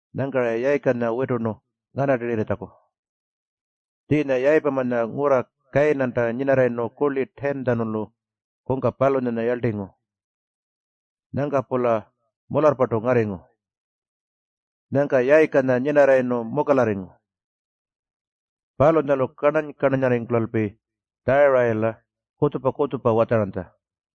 Nyangka-ra Yayikanya witurnu nganartirritjaku. Tjiinya Yayipamanya ngurra Kayinanta nyinarrayirnu kurli 10-tjanulu kungka palunyanya yarltingu. Nyangka-pula mularrpartu ngarringu. Nyangka Yayikanya nyinarrayirnu mukalarringu. Palunyalu karnany-karnanyarringkulalpi Tjarayila kutjupa-kutjupa watjaranytja.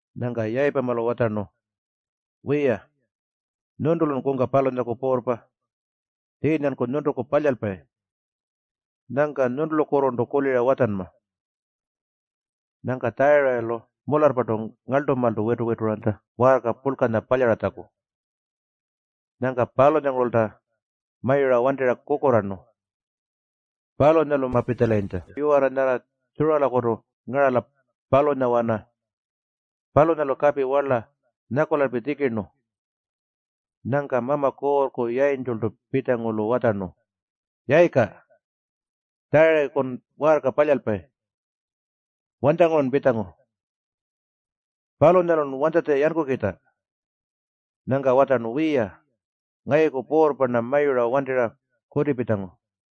Nyangka Yayipamalu watjarnu, “Wiya, nyuntulun kungka palunyaku puurrpa. Tjiinyanku nyuntuku palyalpayi. Nyangka nyuntulukurrurntu kulira watjanma.” Nyangka Tjarayilu mularrpartu ngarltumaaltu witu-wituranytja waarka purlkanya palyaratjaku. Nyangka palunyangurulta mayura wantirra kukurraarnu. Palunyalu mapitjalayintja yiwarra nyarra Tjuralakutu ngarala, palunyawana. Palunyalu kapi warla nyakulalpi tjikirnu. Nyangka Mama Kuurrku yayintjultu pitjangu-lu watjarnu, “Yayika, Tjarayikun waarka palyalpayi. Wanytjangurun pitjangu? Palunyalun wanytjatja yankukitja?” Nyangka watjarnu, “Wiya, ngayuku puurrpa-rna mayura wantirra kutipitjangu.”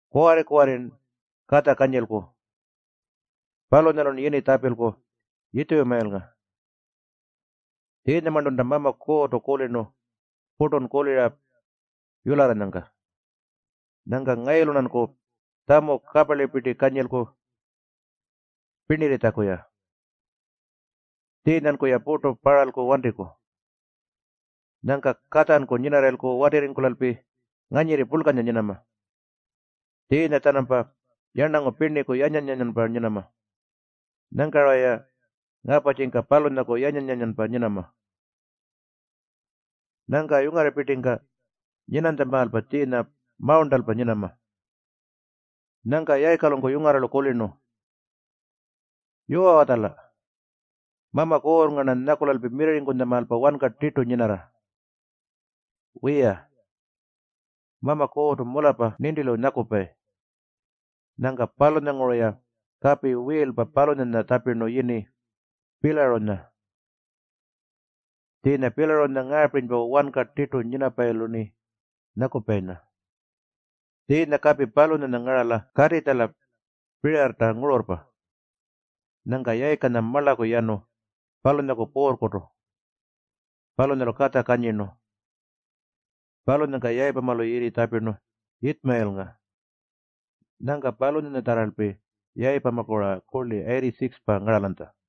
Kuwarri-kuwarrin katja kanyilku. Palunyalun yini tjapilku Yitjumayilnga. Tjiinyamarntunta Mama Kuurrtu kulirnu purtun kulira yularranyangka. Nyangka ngayulu-rnanku tjamu kaparlipirti kanyilku pirnirritjaku-ya. Tjiinyanku-ya purtu parralku wantiku. Nyangka katjanku nyinarrayilku watirringkulalpi nganyirri purlkanya nyinama. Tjiinya-tjanampa yarnangu pirniku yanyan-yanyanpa nyinama. Nyangka-raya ngaparrtjika palunyaku yanyan-yanyanpa nyinama. Nyangka yungarrapirtingka nyinanytjamaalpa tjiinya mawurntalpa nyinama.” Nyangka Yayikalunku yungarralu kulirnu, “Yuwa-watjala. Mama Kuurrnga-rna nyakulalpi mirrirringkutjamaalpa wanka tirtu nyinarra. Wiya, Mama Kuurrtu mularrpa nintilu nyakupayi.” Nyangka palunyanguru-ya kapi wiilpa palunyanya tjapirnu yini Piilarunya. Tjiinya Piilarunya ngaapirinypa, Wanka Tirtu Nyinapayilu-rni Nyakupayinya. Tjiinya kapi palunyanya ngarala Kaatitjala Pirirrta ngururrpa. Nyangka Yayikanya marlaku yanu palunyaku puurrkutu. Palunyalu katja kanyirnu. Palunyangka Yayipamalu yini tjapirnu Yitjumayilnga. Nyangka palunyatjarralpi Yayipamaku-ra kurli 86-pa ngaralanytja.